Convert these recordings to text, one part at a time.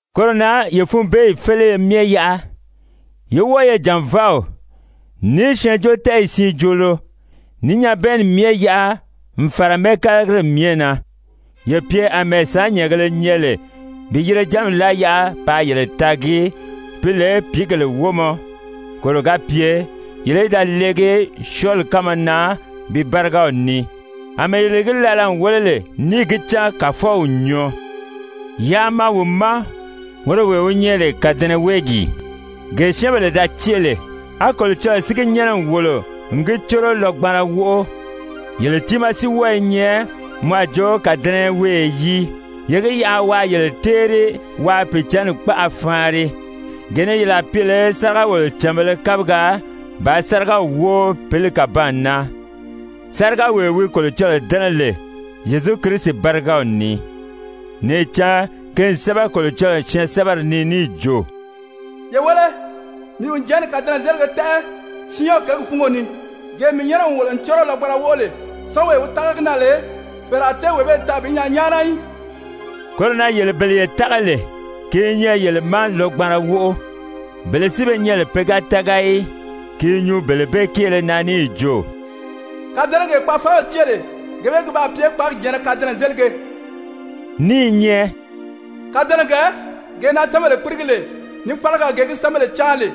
Koro na ye funbeeyi féleye myɛ yaʔa, yé wɔ́ɔ ye jànvaaw, ní syɛɛnjóotɛɛyi siin joolo, ní nyabɛɛnni myɛ yaʔa n fàra mɛ́ɛkalagiri myɛ na. Ye pye àmɛɛ sàánnyɛɛngēle nyɛ lè bi yirejanmi láa yaʔa paa yele taagi pi lè pìígèle wómɔ, koro ga pye yele í da leegi syɔɔli kánma na pi bárigaw ni, àmɛɛ yele gi laala n wéle lè níì gi cán Kàfɔw n nyɔɔ. Yaa maa wi ma, woro wee wi nyɛ lè kàdɛnɛweegi, gee syɛ́ɛnbèle da cée lè, á Kolocɔlɔɔ si gi nyɛ́nɛ n wòlo n gi córo lɔgbanra wóʔo, yele tiimaa si wɔ́ɔ i nyɛ mɔ a jo kàdɛnɛweeye yii, ye gi yaʔa waa yele téeri waa Pìicǎnni kpaʔa faanri, gee ni yele a pye lè sáriga-wòlocànbēle kabigaa bàā sárigaw wóo pǐli kàbaan na, sárigawee wi Kolocɔlɔɔ dɛ́nɛ lè, Zyezu Kirisi bárigaw ni. Níì cán ki n sɛ́bɛ Kolocɔlɔɔ syɛɛnsɛbɛri ni níì jo: «Ye wéle, mii n jɛ̀ɛ́nni kàdɛnɛzelige tɛ́ʔɛ Siyɔn kěgi fúngo ni, gee mii nyɛ́nɛ n wòlo n córo lɔgbanra wóʔo lè, syɔ́ɔnwee wi tága gi na lè, fɛ̀ɛrɛ a tée wee bee taa bi nyaa nyáana í.» Koro na yele bele ye tága lè, ki i nyɛ yele ma lɔgbanra wóʔo. Bele si be nyɛ lè pe ga tága í, ki i nyuu bele bee kéele na níì jo: «Kàdɛnɛgee kpaafaanbèle cée lè, gee bee ki baa pye kpáagi jɛ̀ɛnnɛ kadɛnɛzelige,» ní i nyɛ: «Kàdɛnɛgɛ, gee na syɛ́ɛnbèle kpírigi lè, ní fálaga, gee gi syɛ́ɛnbèle cáan lè.»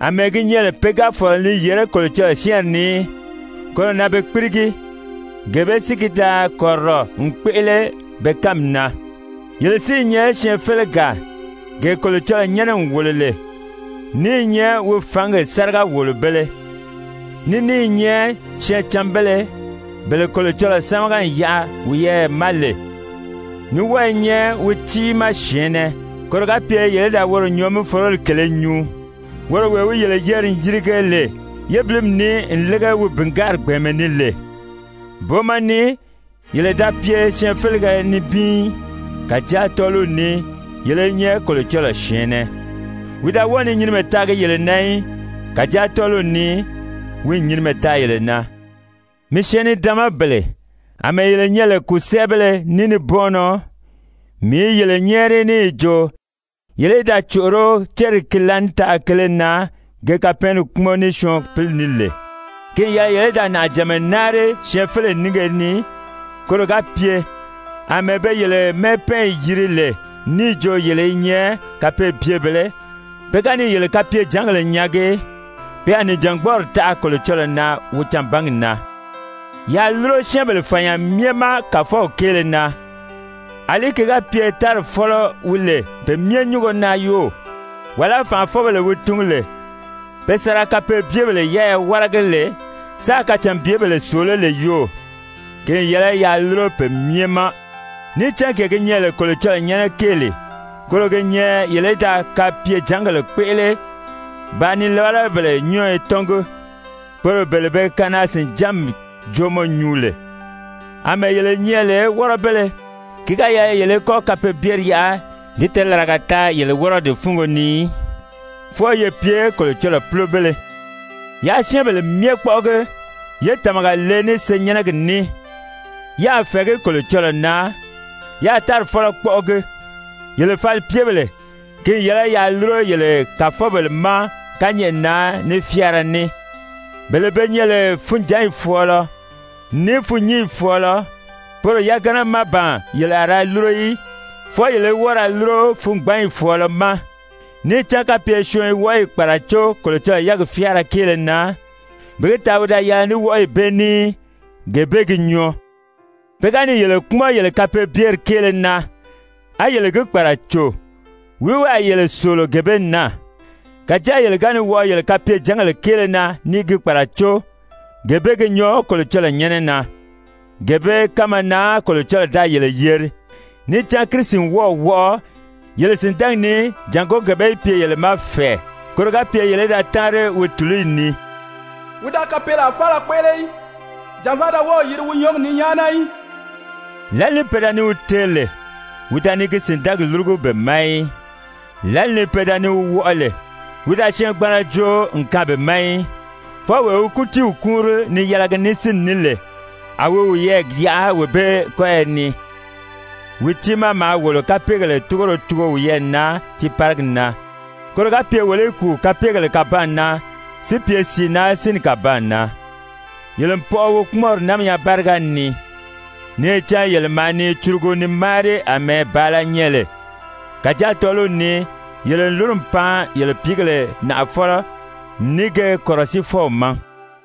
Amɛɛ gi nyɛ lè pe ga fɔ̀lɔ ni yèré Kolocɔlɔɔ syɛ́ɛnri ni í, koro na be kpírigi, gee bee si ki da kɔ̀rirɔ n kpéʔele be kánmi na. Yele si i nyɛ syɛɛnfelegaa, gee Kolocɔlɔɔ nyɛ́nɛ n wòlo lè, ní i nyɛ wi fǎngi sáriga-wòlobēle, ní ní i nyɛ syɛɛncanbéle, bele Kolocɔlɔɔ sámaga n yaʔa wiyɛɛ ma lè, ní wɔ́ɔ i nyɛ wi tiimaa syɛ̀ɛnnɛ, koro ga pye yele í da woro nyɔɔ-mí-foroli kèlē nyuu, woro wee wi yele yeri n yirige lè yébilimi ni n lége wi bìngaari gbɛ̀ɛnmɛ ni lè. Booma ni yele da pye syɛɛnfelege nibin í, kàjáa tɔ́ɔliw ni yele i nyɛ Kolocɔlɔɔ syɛ̀ɛnnɛ. Wi da wɔ́ɔ ni nyinimɛ taagi yele na í, kàjáa tɔ́ɔliw ni wi n nyinimɛ taa yele na. Mii syɛɛn-nidaanmabèle, àmɛɛ yele nyɛ lè kùsɛɛbéle ní nibɔɔnnɔ, mii i yele nyɛ́ɛri níì jo yele í da còʔoró céri ki laànitaʔa kele na ge kapɛɛnni kpúmɔn ní syɔɔn pǐli ní lè. Ki n yɛlɛ yele í da nàʔajànma náari syɛɛnfeleyi nínge ni, koro ga pye, àmɛɛ be yele mɛ́ɛpɛɛnyi yiri lè níì jo yele i nyɛ kapeebyebèlē, pe ga ni yele kapyejǎngèle nyaagi, pe a nìjangbɔɔri taʔa Kolocɔlɔɔ na wi canbangi na. Yaa lúro syɛ́ɛnbèle fànya myɛ ma Kàfɔw kéele na, àlí ki ga pye tári fɔ́lɔ wi lè pe myɛ nyúngo na yoo, wàlá fànʔafɔbèle wi tungu lè pe sa ra kapeebyebèle yɛ́ɛyɛ wáragi lè sáā kacànbyebèle sòoló lè yoo, ki n yɛlɛ yaa lúro pe myɛ ma. Níì cán gee gi nyɛ lè Kolocɔlɔɔ nyɛ́nɛ kéeli, koro gi nyɛ yele í da kapyejàngèle kpéʔele bàā nilabalabèle nyɔ́ɔyɔ tɔ́ngi, poro bele be kanaa-sìnjánmi jóomɔ nyuu lè, àmɛɛ yele nyɛ lè wɔ́rɔbéle, ki ga yɛlɛ yele í kɔ́ kapeebyeri yaʔa di tɛɛlaraga taa yele wɔ́rɔdi fúngo ni í, fwɔɔ ye pye Kolocɔlɔɔ púlobéle. Yaa syɛ́ɛnbèle myɛ kpɔ́ʔɔgi, yé tàmaga le ní senyɛnnɛgi ní, yáā fɛ̀ɛgí Kolocɔlɔɔ na, yáā tári fɔ́lɔ kpɔ́ʔɔgi. Yele falipyebèle, ki n yɛlɛ yaa lúro yele kàfɔbèle ma kányɛʔɛ na ní fyáara ní, bele be nyɛ lè funjǎnyi fɔ̀ɔlɔ, ní fûnnyinyi fɔ̀ɔlɔ, poro yagana má ban yele a ra lúro í, fwɔɔ yele í wɔ́ɔ ra lúro fungbanyi fɔ̀ɔlɔ ma, níì cán kapye syɔɔn i wɔʔɔyi kpàracó Kolocɔlɔɔ yɛ́ɛgi fyáara kéele na, bi gi taa wi da yɛlɛ ní wɔʔɔyi bee ní í, gee bee gi nyɔɔ. Pe ga ni yele kpúmɔn yele kapeebyeri kéele na, á yele gi kpàraco, wìí wi a yele sòolo gee bee na? Kàjáa yele ga ni wɔʔɔ yele kapyejǎngèle kéele na ní i gi kpàracó, gee bee gi nyɔɔ Kolocɔlɔɔ nyɛ́nɛ na. Gee bee kánma na Kolocɔlɔɔ da yele yeri, níì cán Kirisi n wɔ́ɔ̀ wɔʔɔ yele sìndɛɛgi ni jàngó gee bee í pye yele ma fɛ̀ɛ, koro ga pye yele í da táanri wi tùluyi ni. Wi da kapeelaa faala kpéʔele í, jànvaa da wɔ́ɔ̀ yiri wi nyɔ́ɔgi ni nyáana í. Lǎli ni pe da ni wi teeri lè, wi da ni gi sìndɛɛgi lúrugu be ma í. Lǎli ni pe da ni wi wɔʔɔ lè, wi da syɛɛngbanra joo n kaan be ma í, fwɔɔ wee wi kútiiw kúunri ni yɛlɛgi ní sínni ní lè, a wi wiyɛɛ yaʔa wee bee kɔ́yɔ ni. Wi tiimaa maa wolo kapeegèle túgoro tugo wiyɛɛ na tiiparigi na, koro ga pye wolo í kùu kapeegèle kàbaan na si pye sìi na sínni kàbaan na. Yele n pɔʔɔ wi kpúmɔnri námiya báriga ni. Níì cán yele maa ni curugu ni máari àmɛɛ bàala nyɛ lè, kàjáa tɔ́ɔliw ni yele n lúru n pan yele pìígèle Nàʔafɔlɔ, ní ge Kɔ̀rɔsiifɔw ma.